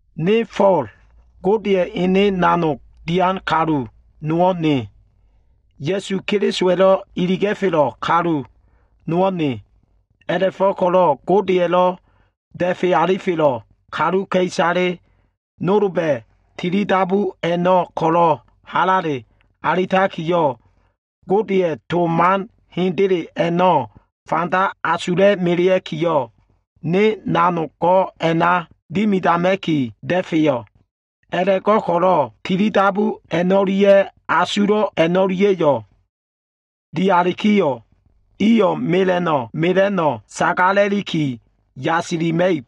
Ne Fo꞉l, Godeya꞉ ene nanogdo꞉ dian kalu nowo꞉ ne. Ya꞉su Kelisowa꞉lo꞉ iliga꞉felo꞉ kalu nowo꞉ ne. A꞉la꞉fo꞉ko꞉lo꞉ Godeya꞉lo꞉ da꞉fe alifelo꞉ kaluka꞉isale nolba꞉ tilidabu a꞉no꞉ ko꞉lo꞉ halale alitakiyo꞉, Godeya꞉ to man hendele a꞉no꞉ fanda asula꞉ melea꞉kiyo꞉, ne nanog we dimidama꞉ki da꞉feyo꞉. A꞉la꞉go꞉ko꞉lo꞉ tilidabu a꞉no꞉lia꞉ asulo꞉ a꞉no꞉lia꞉yo꞉ dialikiyo꞉, iyo꞉ mela꞉no꞉ mela꞉no꞉ sagala꞉liki yasilima꞉ib.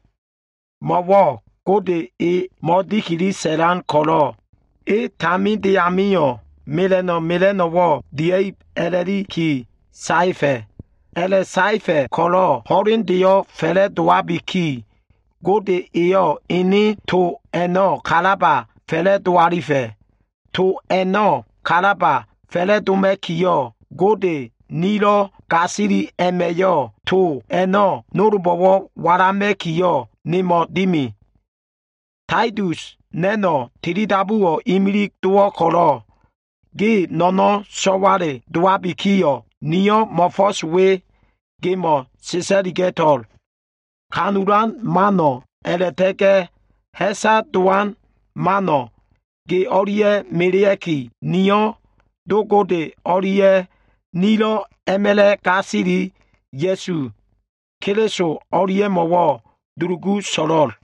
Mo꞉wo꞉ Gode e mo꞉dikili sa꞉lan ko꞉lo꞉, eyo꞉ taminde amio꞉ gio꞉ mela꞉no꞉ mela꞉no꞉wo꞉ dia꞉ib a꞉la꞉liki saefa꞉. A꞉la꞉saefa꞉ ko꞉lo꞉ ho꞉lendeyo꞉ fa꞉la꞉dowabiki, Gode eyo꞉ ene to a꞉no꞉ kalaba fa꞉la꞉do alifa꞉. To a꞉no꞉ kalaba fa꞉la꞉doma꞉kiyo꞉, Gode nilo꞉ gasili a꞉ma꞉yo꞉ to a꞉no꞉ nolbo꞉wo꞉ walama꞉kiyo꞉, nemo꞉ dimi. Taitus, na꞉no꞉ tilidabuwo꞉ imilig dowo꞉ ko꞉lo꞉, ge no꞉no꞉n so꞉wale dowabikiyo꞉, niyo꞉ mo꞉fo꞉s we gemo꞉ sa꞉sa꞉liga꞉to꞉l. Ha꞉fo꞉ disa꞉lan mano꞉ a꞉la꞉ta꞉ga꞉ ha꞉sa dowan man a꞉no꞉ ge o꞉lia꞉ melea꞉ki, niyo꞉ Do Gode o꞉lia꞉ nilo꞉ a꞉ma꞉la꞉ gasili Ya꞉su Keliso o꞉lia꞉mo꞉wo꞉ dulugu so꞉lo꞉l.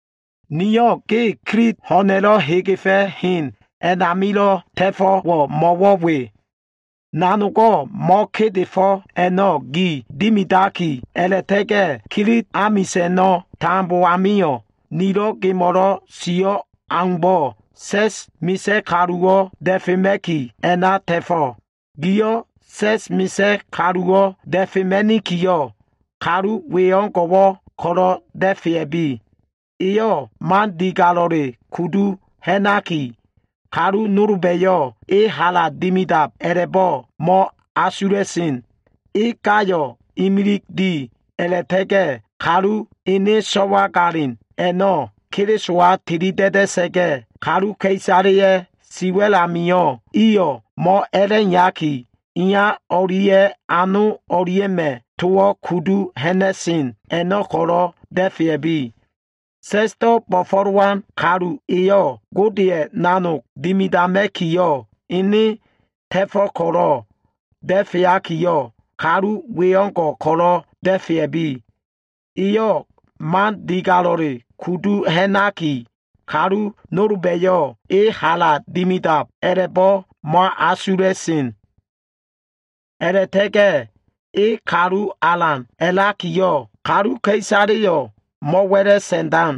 Niyo꞉ ge Kilit ho꞉na꞉lo꞉ hegefa꞉ hen a꞉namilo꞉ ta꞉fo꞉wo꞉ mo꞉wo꞉ we. Nanogo꞉ mo꞉kedefo꞉ a꞉no꞉ gi dimidaki a꞉la꞉ta꞉ga꞉ Kilit amisa꞉no꞉ tambo amio꞉ nilo꞉ gemo꞉lo꞉ sio꞉ aumbo꞉, sa꞉sdo꞉ bo꞉fo꞉lowan kaluwo꞉ da꞉fema꞉ki, a꞉na ta꞉fo꞉. Giyo꞉ sa꞉s amilo꞉ misa꞉ kaluwo꞉ da꞉fema꞉nikiyo꞉, kalu we o꞉ngo꞉ ko꞉lo꞉ da꞉fea꞉bi. Eyo꞉ man digalo꞉le kudu ha꞉naki, kalu nolba꞉yo꞉ e hala dimidab a꞉la꞉bo꞉ mo꞉asula꞉sen. E gayo꞉ imilig di. A꞉la꞉ta꞉ga꞉ kalu ene so꞉wagalin a꞉no꞉ Kelisowa tilida꞉da꞉sa꞉ga꞉, kaluka꞉isaleya꞉ siwa꞉l amio꞉ iyo꞉ mo꞉a꞉la꞉iyaki, iya o꞉lia꞉ ano o꞉lia꞉ma꞉ towo꞉ kudu ha꞉na꞉sen a꞉no꞉ ko꞉lo꞉ da꞉fea꞉bi. Sa꞉sdo꞉ bo꞉fo꞉lowan kalu iyo꞉, Godeya꞉ ene nanog bo꞉fo꞉lowa꞉sen ko꞉lo꞉ giliyo꞉ kalu we o꞉ngo꞉ ko꞉lo꞉ da꞉fea꞉bi. Eyo꞉ man digalo꞉le kudu ha꞉naki, kalu nolba꞉yo꞉ e hala dimidab a꞉la꞉bo꞉ mo꞉asula꞉sen. A꞉la꞉ta꞉ga꞉ e kalu alan a꞉lakiyo꞉, kaluka꞉isaleyo꞉ mo꞉wa꞉la꞉sa꞉ndan.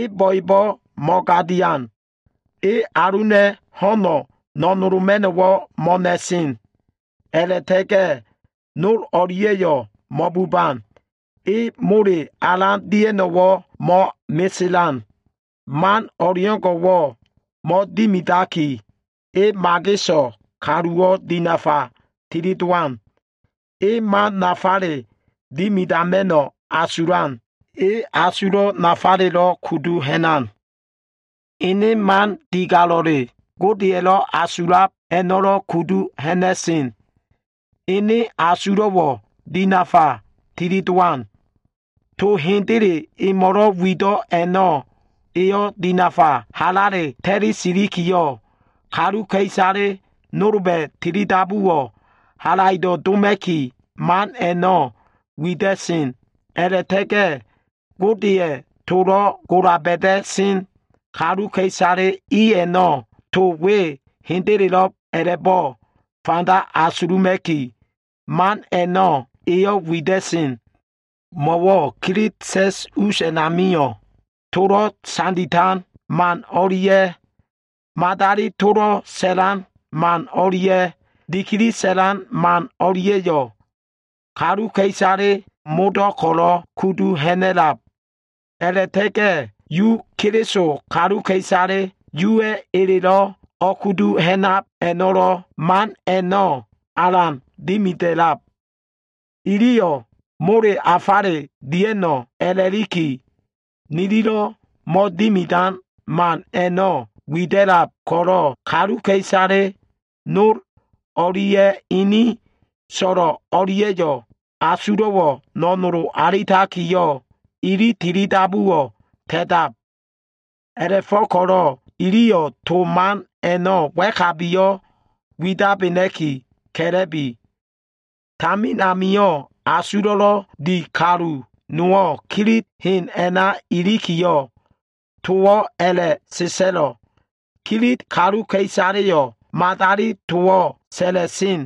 E bo꞉ebo꞉ mo꞉gadian. E aluna꞉ ho꞉no꞉ no꞉noloma꞉no꞉wo꞉ mo꞉nan. A꞉la꞉ta꞉ga꞉ nol o꞉lia꞉yo꞉ mo꞉buban. E mole alan dia꞉no꞉wo꞉ mo꞉meselan. Man o꞉leo꞉ngo꞉wo꞉ mo꞉dimidaki, e mageso꞉ kaluwo꞉ dinafa tilidowan. E man nafale dimidama꞉no꞉ asulan. E asulo꞉wo꞉ nafale kudu ha꞉nan. Ene man digalo꞉le, Godeya꞉lo꞉ asulab a꞉no꞉lo꞉ kudu ha꞉na꞉sen. Ene asulo꞉wo꞉ dinafa tilidowan. To hendele emo꞉lo꞉ wido꞉ a꞉no꞉, eyo꞉ dinafa halale ta꞉li silikiyo꞉, kaluka꞉isale nolba꞉ tilidabuwo꞉ halaido꞉ doma꞉ki man a꞉no꞉ wida꞉sen. A꞉la꞉ta꞉ga꞉ Godeya꞉ tolo꞉ gola ba꞉da꞉sen kaluka꞉isale i a꞉no꞉ to we hendelelo꞉b a꞉la꞉bo꞉ fanda asuluma꞉ki, man a꞉no꞉ eyo꞉ wida꞉sen. Mo꞉wo꞉ Kilit sa꞉s us a꞉namio꞉, tolo꞉ sanditan man o꞉lia꞉, madali tolo꞉ sa꞉lan man o꞉lia꞉, dikili sa꞉lan man a꞉no꞉lia꞉yo꞉ kaluka꞉isaleyo꞉ modo꞉ ko꞉lo꞉ kudu ha꞉na꞉lab. A꞉la꞉ta꞉ga꞉ kalu nolba꞉yo꞉ Yuma Keliso kaluka꞉isale a꞉no꞉ Yuwa꞉ eleyo꞉ ko꞉lo꞉ o꞉kudu hamana꞉kilo꞉ diboda꞉sen iliyo꞉lo꞉ man a꞉no꞉ alan dimida꞉lab. Iliyo꞉ mole afale dia꞉no꞉ a꞉la꞉liki, nililo꞉ mo꞉dimidan man a꞉no꞉ wida꞉lab ko꞉lo꞉, kaluka꞉isale nol o꞉lia꞉ ini so꞉lo꞉ o꞉lia꞉yo꞉ asulo꞉wo꞉ no꞉nolo alitakiyo꞉, ili tilidabuwo꞉ ka ta꞉tab. A꞉la꞉fo꞉ko꞉lo꞉ iliyo꞉ to man a꞉no꞉ wa꞉kabiyo꞉ widabena꞉ki ka꞉la꞉bi. Tamin amio꞉ asulo꞉lo꞉ di kalu nowo꞉ Kilit hen a꞉na ilikiyo꞉, towo꞉ a꞉la꞉sa꞉sa꞉lo꞉, “Kilit kaluka꞉isaleyo꞉ madali towo꞉ sa꞉la꞉sen.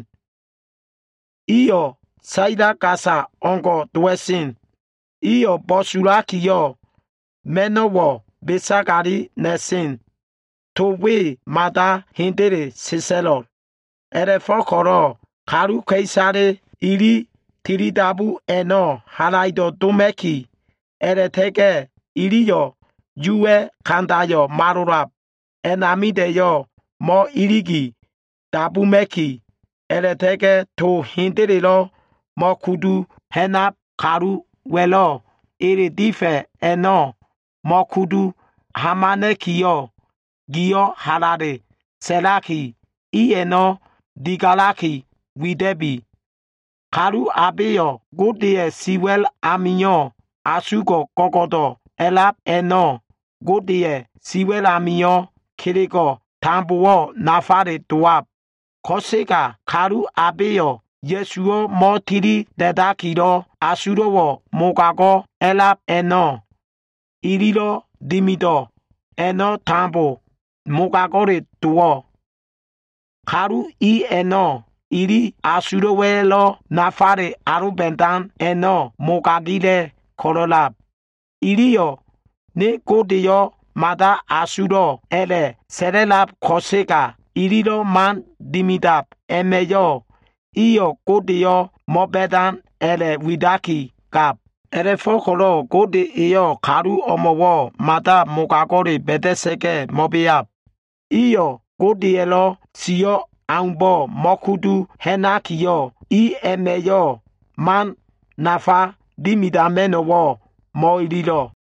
Iyo꞉ saila gasayo꞉ o꞉ngo꞉ dowa꞉sen. Iyo꞉ bo꞉sulakiyo꞉, ma꞉no꞉wo꞉ besagali na꞉sen.” To we mada hendele sa꞉sa꞉lo꞉. A꞉la꞉fo꞉ko꞉lo꞉ kaluka꞉isale ili tilidabu a꞉no꞉ halaido꞉ doma꞉ki, a꞉la꞉ta꞉ga꞉ iliyo꞉ Yuwa꞉ kandayo꞉ malolab a꞉namida꞉yo꞉ mo꞉iligi dabuma꞉ki, a꞉la꞉ta꞉ga꞉ to hendelelo꞉ mo꞉kudu ha꞉nab kaluwa꞉lo꞉ ele difa꞉ a꞉no꞉, mo꞉kudu hamana꞉kiyo꞉, giyo꞉ halale sa꞉laki, i a꞉no꞉ digalaki wida꞉bi. Kaluka꞉isale abeyo꞉ Godeya꞉ siwa꞉l amio꞉ asugo꞉ go꞉go꞉do꞉lo꞉ a꞉lab i a꞉namio꞉, kelego꞉wo꞉ tambo nafale dowo꞉. Ko꞉sega kaluka꞉isale abeyo꞉ Ya꞉suwo꞉ mo꞉tilida꞉dakilo꞉, asulo꞉wo꞉ mogago꞉ a꞉lab i amio꞉, kelego꞉wo꞉ tambo mogago꞉le dowab. Kalu i a꞉no꞉ ili asulo꞉wa꞉lo꞉ nafale aloba꞉dan a꞉no꞉ mogagila꞉ ko꞉lo꞉lab. Iliyo꞉ “Ne Godeyo꞉ mada asulo꞉” a꞉la꞉sa꞉la꞉lab ko꞉sega, ililo꞉ man dimidab a꞉ma꞉yo꞉, iyo꞉ Godeyo꞉ mo꞉ba꞉dan a꞉la꞉ widakigab. A꞉la꞉fo꞉ko꞉lo꞉ Gode eyo꞉ kalu o꞉mo꞉wo꞉ mada mogago꞉le ba꞉da꞉sa꞉ga꞉ mo꞉beab. Iyo꞉ Godeya꞉lo꞉ sio꞉ aumbo꞉ mo꞉kudu ha꞉nakiyo꞉, i a꞉ma꞉yo꞉ man nafa dimidama꞉no꞉wo꞉ mo꞉ililo꞉.